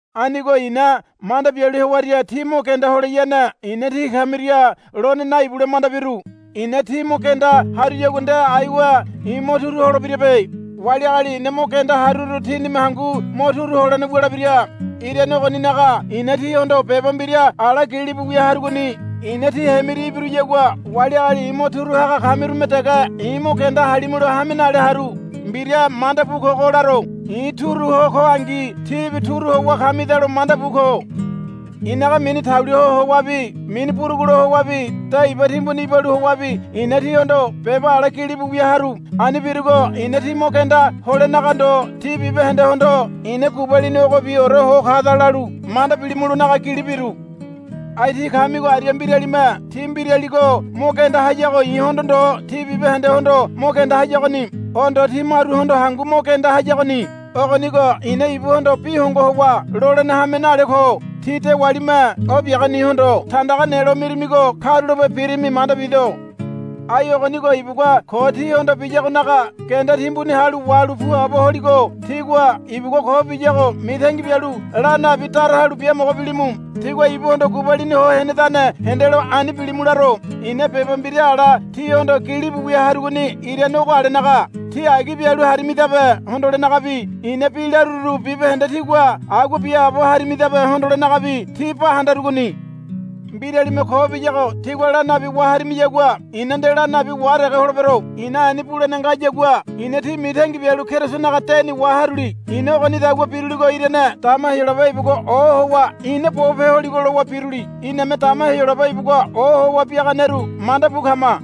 Anigo i̱na manda bialu hewaria tí mo genda holeyane i̱na tí kamiria lone naibule manda biru. I̱na tí mo genda haruyagua nde aiwa i̱ mo turu holebirabe. Wali agali i̱na mo genda haruru tinime hangu mo turu holene wulebira. Irane ogoninaga i̱na tíhondo beba mbira ala gilibu wia harugoni. I̱na tí hemiria ibiruyagua wali agali i̱ mo turu haga kamirume dege i̱ mo genda halimulo hame nale haru. Mbira manda bu kogo laro. I̱ turu ho koangi tíbi turu howa kamidalo manda bu ko. I̱naga mini taulia ho howabi mini burugulo howabi de iba timbuni ibalu howabi i̱na tíhondo beba ala gilibu wia haru. Ani birugo i̱na tí mo genda holenaga ndo tí bibahendehondo i̱na gubalini ogobiore ho kada lalu manda bilimulonaga gili biru. Ai tí kamigo aria mbiralime tí mbiraligo mo genda hayago i̱hondo ndo tí bibahendehondo mo genda hayagoni. O ndo tí maruhondo hangu mo genda hayagoni. Ogonigo i̱na ibuhondo bi hongo howa lolene hame nale ko. Tí dewalime o biagonihondo tandaga nelo mirimigo karulape birimi manda bido. Ai ogonigo ibugua ko tíhondo biyagonaga genda timbuni halu wahalu puabo holigo tígua ibugua ko biyago mitangi bialu la nabi dara halu biamogo bilimu. Tígua ibuhondo gubalini ho henedane hendelo ani bilimu laro. I̱na beba mbira ala tíhondo gilibu wia harugoni irane ogo alenaga. Tí agi bialu harimidabe hondolenagabi i̱na bi laruru bibahende tígua agua biaabo harimidabe hondolenagabi tí ba handarugoni. Mbiralime ko biyago tígua la nabi waharimiyagua i̱na nde la nabi wa dege holebero. I̱na ani bulene ngayagua i̱na tí mitangi bialu Kerisonaga deni waharuli. I̱na ogonidagua biruligo irane dama Heyolabe ibugua ohowa ina bope holigo lowa biruli. Iname dama Heyolabe ibugua ohowa biaganeru manda bu kama.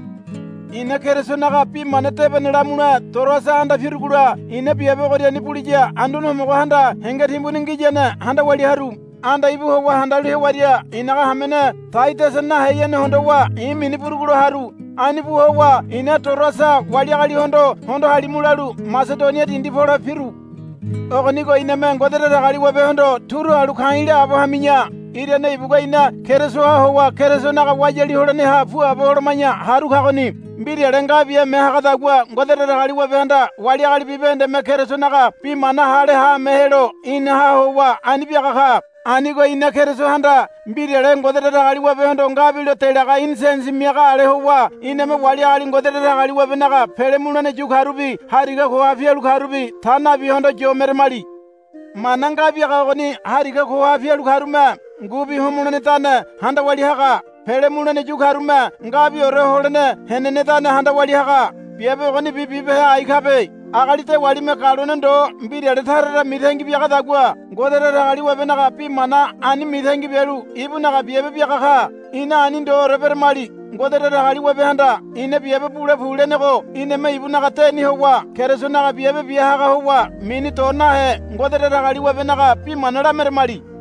I̱na Kerisonaga Bi Mana Debene lamule Toroasa anda pirugola i̱na biabe ogoriani buliya Anduane Homogohanda henge timbuni ngiyane handa walia haru. Anda íbu howa handalu hewaria i̱naga hamene Taidasa naheyane hondowa i̱ mini burugulo haru. Ani bu howa i̱na Toroasa wali agalihondo, Hondo halimu, lalu Masedonia dindi pole piru. Ogonigo iname Ngode Datagaliwabehondo turu halu ka̱i̱ laabo hami̱ya. Irane ibugua ina Kerisoha howa Kerisonaga wayali holeneha puabo holoma̱ya haru kagoni. Mbirale ngabiame hagadagua Ngode Datagaliwabehanda wali agali bibahendeme Kerisonaga bi mana hale haame helo inaha howa ani biaga ka. Anigo ina Kerisohanda mbirale Ngode Datagaliwabehondo ngabilo delaga inisenesi miaga ale howa iname wali agali Ngode Datagaliwabenaga pele mulene yu karubi hariga koha pialu karubi ta nabihondo yo meremali. Mana ngabiaga ogoni hariga koha pialu karume ngubi homolenedane handa walia haga. Pele mulene yu karume ngabiore holene henenedane handa walia haga. Biabe ogonibi bibehe ai kabe. Agali dewalime galone ndo mbirale tara tara mitangi biagadagua Ngode Datagaliwabenaga bi mana ani mitangi bialu ibunaga biabe biaga ka. Ina ani ndoore beremali. Ngode Datagaliwabehanda ina biabe bule pu lenego iname ibunaga deni howa Kerisonaga biabe bia haga howa mini do nahe Ngode Datagaliwabenaga bi mana lameramali.